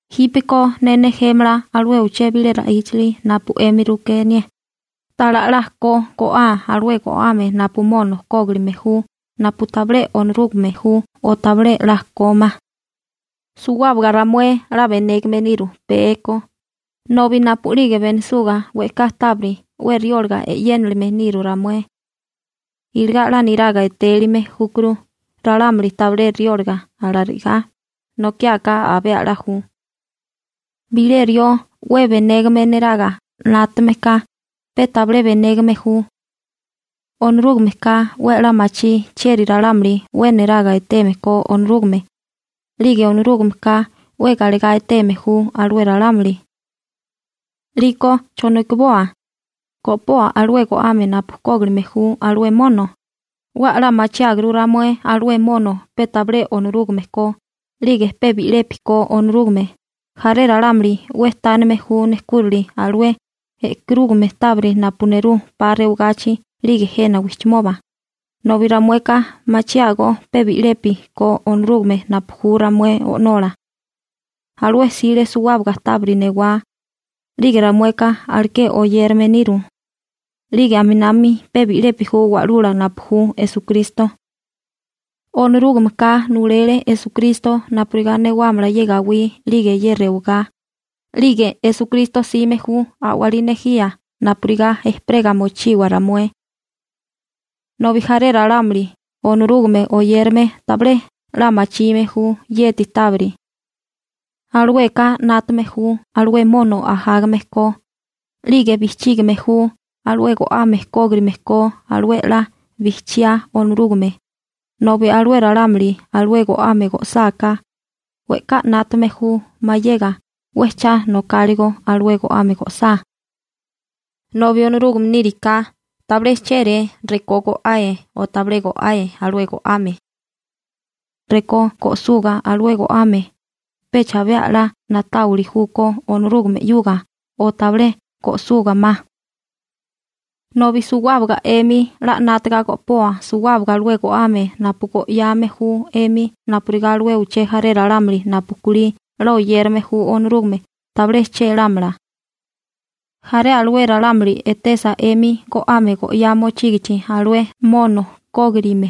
Jípeko ne nejémala alué uché bilé ra'íchali napu 'emi rukénié, ta'lá 'la ko go'aa alué go'ame napu mono kógirime ju napu tabilé Onorúgame ju o tabilé 'la kómá. Suwábaga ramué 'la benégame niru pee ko, nobi napu'lige benisuga we'ká tábiri 'we riólaga e'yénilime niru ramué. Iligá 'la niraga etélime júkuru ralámuli tabilé riólaga, alanokiáká abé 'la ju. Bilé rió 'we benégame neraga 'nátame ka, pe tabilé benégame ju. Onorúgameka 'we 'la machí chieri ralámuli 'we niraga eteme ko Onorúgame, 'lige Onorúgameka 'we galegá eteme ju alué ralámuli. 'Liko ¿chonokiboa? ¿Go'poa alué go'ame napu kógilime ju alué mono? 'We 'la machiáguru ramué alué mono pe tabilé Onorúgame ko, 'lige pe bi'lepi ko Onorúgame. Jaré ralámuli 'we tánime ju nejkúrali alué e'karúgame tábiri napu nerú 'pa rewagachi 'lige jena wijchimoba, nobi ramueka machiágó pe bi'lepi ko Onorúgame napu ju ramué O'nola. Alué 'sile suwábaga tábiri newá. 'Lige ramueka aleké oyérame niru. 'Lige aminami pe bi'lepi ju Wa'lula napu ju Esukristo. Onorúgameka nulele Esukristo napurigá newámala ye gawí 'lige rewagá, 'lige Esukristo 'sime ju a'walí nejía napurigá ejperega mochiwa ramué. Nobi jaré ralámuli Onorúgame oyérame tabilé 'la machime ju yeti tábiri. Alueka 'nátame ju alué mono ajágame ko, 'lige bijchígime ju alué go'ame kógirime ko alué 'la bijchiá Onorúgame, nobi alué ralámuli alué go'ame go'sáká, we'ká 'nátame ju mayega 'we cha nokáligo alué go'ame go'sá. Nobi Onorúgame níriká tabilé chéré rekó go'ae o tabilé go'ae alué go'ame. Rekó go'suga alué go'ame, pecha abé 'la na'táwili júkó Onorúgame 'yuga o tabilé go'suga ma. Nobi suwábaga 'emi 'la 'nátaga go'poa suwábaga alué go'ame napu go'yame ju 'emi napurigá alué uché jaré ralámuli napu kulí 'la oyérame ju Onorúgame tabilé chélámala. Jaré alué ralámuli etesa 'emi go'ame go'yá mochígichi alué mono kógirime,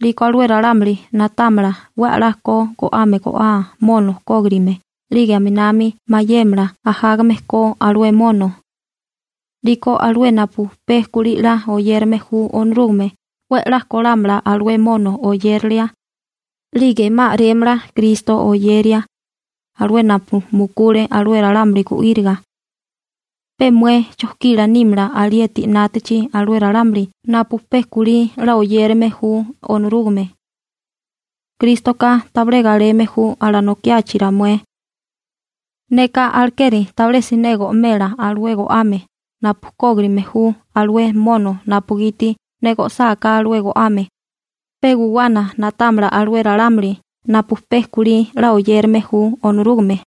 'liko alué ralámuli na'támala 'we a'lá ko go'ame go'aa mono kógirime 'lige aminami mayémala ajágame ko alué mono. 'Liko alué napu pe kulí 'la oyérame ju Onorúgame 'we 'la kólámala alué mono oyérilia, 'lige 'ma a'rémala Kristo oyeria, alué napu mukule alué ralámuli gu'íriga. Pe mué chojkila nímala alieti 'nátachi alué ralámuli napu pe kulí 'la oyérame ju Onorúgame. Krístoka tabilé galeme ju alanokiachi ramué. Neka alekeri tabilé siné go'mela alué go'ame napu kógirime ju alué mono napugiti ne go'sáká alué go'ame, pe guwana na'támala alué ralámuli napu pe kulí 'la oyérame ju Onorúgame.